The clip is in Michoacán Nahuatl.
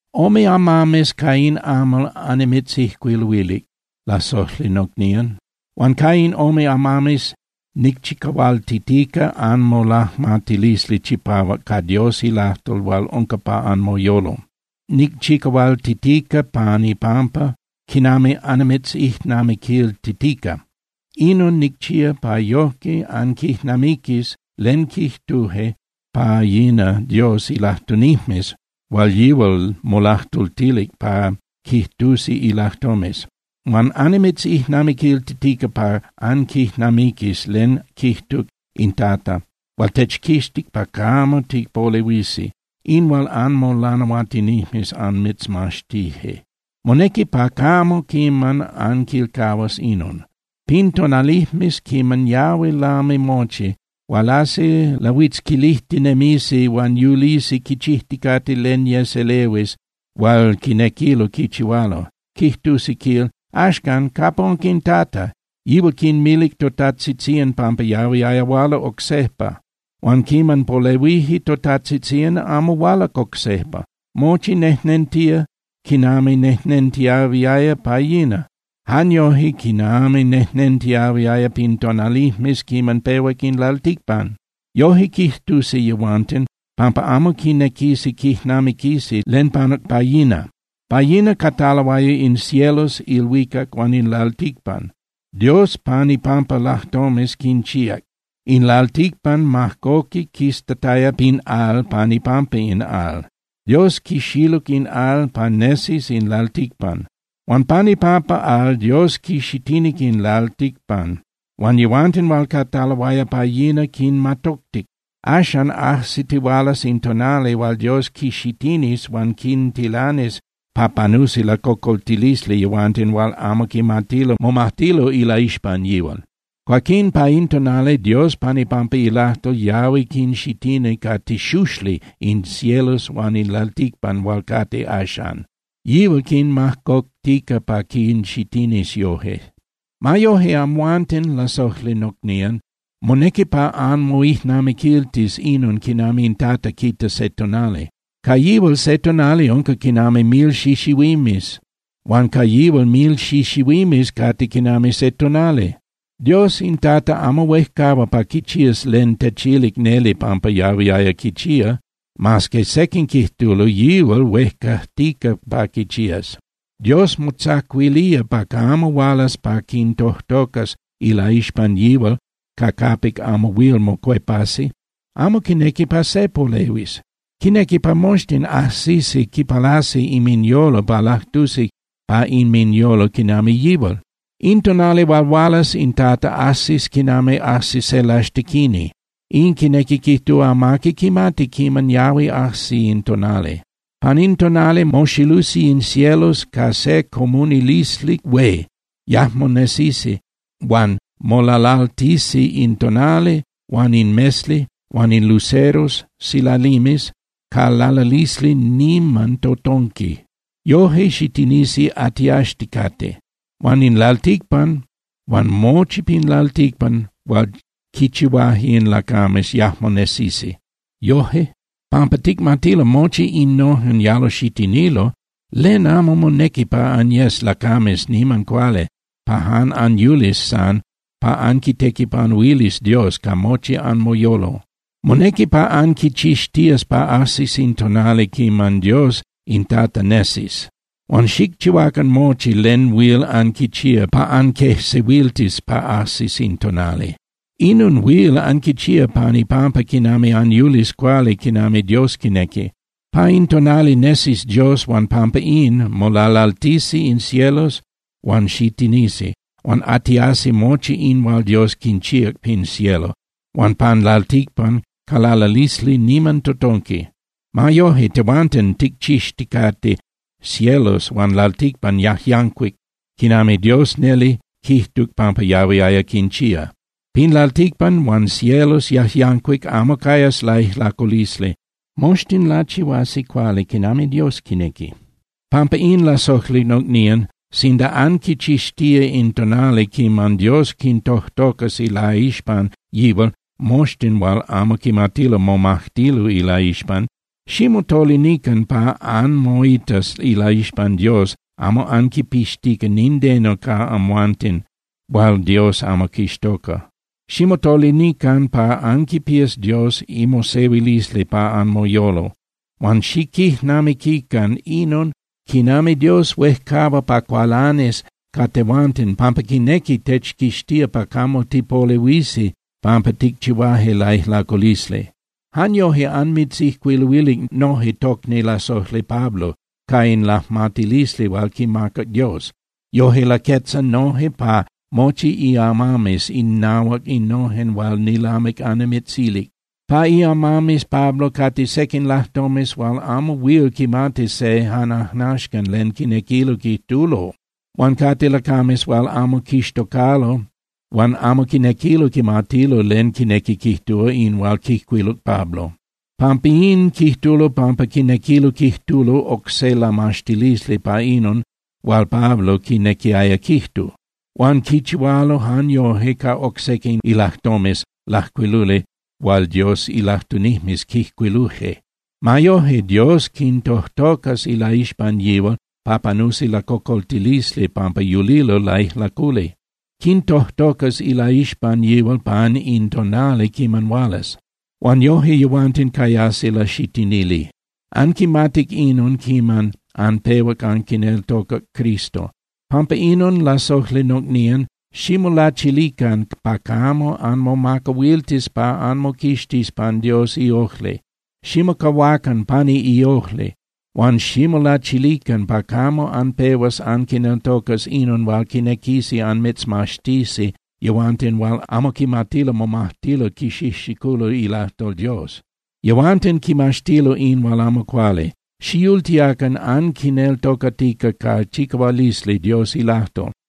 Ome amames ca in amal annimitzijcuiluilic, lasojli nocnían. Huan ca in ome amames nicchicahualtitica anmolajmatilisli chipahuac ca Dios ilajtol hual unca pa anmoyolo. Nicchicahualtitica pan ipampa quinami annimitzijnamiquiltitica. Inon nicchía pa yojque anquijnamiquis len quijtuje pa yina Dios ilajtunijmes hual yihual molajtultilic pa quijtusi ilajtomes. Huan annimitzijnamiquiltitica pa anquijnamiquis len quijtuc in Tata hual techquixtic pa camo tipolehuisi, in hual anmolanahuatinijmes anmitzmaxtije. Monequi pa camo quiman anquilcahuas inon: Pin tonalijmes quiman yahui lami mochi, hualasi lahuitzquilinijmes. Lahuitzquilijtinemisi huan yulisi quichijticate len yes elehuis hual quinequilo quichihualo. Quijtusi, quil: “Axcan, ¿capa unca in Tata? Yihual quinmilic totajtzitzían pampa yahuiaya huala oc sejpa. Huan quiman polehuije totajtzitzían, amo hualac oc sejpa. Mochi nejnentía quinami nejnentiahuiaya pa yina, jan yoje quinami nejnentiahuiaya pin tonalijmes quiman pehuac in lalticpan.” Yoje quijtusi yehuanten, pampa amo quinequisi quijnamiquisi len panuc pa yina. Pa yina cataloaya in cielos (ilhuicac) huan in lalticpan. Dios pan ipampa ilajtomes quinchíac. In lalticpan majcoquic quistataya pin al pan ipampa in al, Dios quixiluc in al pa nesis in lalticpan. Huan pan ipampa al Dios quixitinic in lalticpan. Huan yehuanten hual cataloaya pa yina quinmatoctic. Axan, ajsitihualas in tonali hual Dios quinxitinis huan quintilanis pa panusi lacocoltilisli yehuanten hual amo quimatilo momajtilo ilaixpan yihual. Cuaquín pa in tonali Dios pan ipampa ilajtol yahui quinxitinía ca tixuxli in cielos huan in lalticpan hual cate axan. Yihual quinmajcoctica pa quinxitinis yoje. Ma yoje, amhuanten, lasojli nocnían, monequi pa anmoijnamiquiltis inon quinami in Tata quita se tonali. Ca yihual se tonali unca quinami mil xixihuimes huan ca yihual mil xixihuimes cate quinami se tonali. Dios in Tata amo huejcahua pa quichías len techilic neli pampa yahuiaya quichía, mas que sequin quijtulo yihual huejcajtica pa quichías. Dios motzacuilía pa camo hualas pa quintojtocas ilaixpan yihual ca capic amo huil mocuepasi. Amo quinequi pa se polehuis. Quinequi pa moxtin ajsisi quipalasi inminyolo pa lajtusi pa inminyolo quinami yihual. In tonali hual hualas in Tata ajsis quinami ajsi se laxtequini, in quinequi quijtúa amaqui quimati quiman yahui ajsi in tonali. Pan in tonali moxilusi in cielos ca se comunilisli hué, yajmo nesisi huan molalaltisi in tonali huan in mesli huan in luceros (silalimes) ca lalalisli niman totonqui. Yoje xitinisi atiaxticate. Huan in lalticpan huan mochi pin lalticpan hual quichihuaje in lacames yajmo nesisi. Yoje, pampa ticmatilo mochi innojen yalo xitinilo, ¡len amo monequi pa anyes lacames niman cuali pa jan anyulis san pa anquitequipanuilis Dios ca mochi anmoyolo! Monequi pa anquichixtías pa ajsis in tonali quiman Dios in Tata nesis. Huan xicchihuacan mochi len huil anquichía pa anquejsehuiltis pa ajsis in tonali. Inon huil anquichía pan ipampa quinami anyulis cuali quinami Dios quinequi. Pa in tonali nesis Dios huan pampa in, molalaltisi in cielos huan xitinisi, huan atiasi mochi in hual Dios quinchíac pin cielo huan pan lalticpan ca lalalisli niman totonqui. Ma yoje, tehuanten ticchixticate cielos huan lalticpan yajyancuic, quinami Dios neli quijtuc pampa yahuiaya quinchía. Pin lalticpan huan cielos yajyancuic amo cayas laijlaculisli, moxtin lachihuasi cuali quinami Dios quinequi. Pampa in, lasojli nocnían, sinda anquichixtía in tonali quiman Dios quintojtocas ilaixpan yihual moxtin hual amo quimatilo momajtilo ilaixpan, ximotolinican pa anmoitas ilaixpan Dios amo anquipixtica nindeno ca amhuanten hual Dios amo quixtoca. Ximotolinican pa anquipías Dios imosehuilisli pa anmoyolo. Huan xiquijnamiquican inon quinami Dios huejcahua pa cualanis ca tehuanten pampa quinequi techquixtía pa camo tipolehuisi pampa ticchihuaje laijlaculisli. Jan yoje anmitzijcuiluilic noje tocni lasojli Pablo ca in lajmatilisli hual quimacac Dios. Yoje laquetza noje pa mochi iamames innahuac innojen hual nilamic annimitzilic. Pa iamames Pablo cate sequin lajtomes hual amo huil quimati se jan ajnaxcan len quinequilo quijtulo. Huan cate lacames hual amo quixtocalo huan amo quinequilo quimatilo len quinequi quijtúa in hual quijcuiluc Pablo. Pampín quijtulo pampa quinequilo quijtulo oc se lamaxtilisli pa inon hual Pablo quinequiaya quijtu. Huan quichihualo jan yoje ca oc sequin ilajtomes lajcuiluli hual Dios ilajtunijmes quijcuiluje. Ma yoje, Dios quintojtocas ilaixpan yihual pa panusi lacocoltilisli pampa yulilo laijlaculi. Quintojtocas ilaixpan yihual pan in tonali quiman hualas. Huan yoje yehuanten cayasi laxitinili. Anquimatic inon quiman anpehuac anquineltocac Cristo. Pampa inon, lasojli nocnían, ximolachilican pa camo anmomacahuiltis pa anmoquixtis pan Dios iojli. Ximocahuacan pani iojli. Huan ximolachilican pa camo anpehuas anquineltocas inon hual quinequisi anmitzmaxtisi yehuanten hual amo quimatilo momajtilo quixijxiculo ilajtol Dios. Yehuanten quimaxtilo in hual amo cuali. Xiyultiacan anquineltocatica ca chicahualisli Dios ilajtol.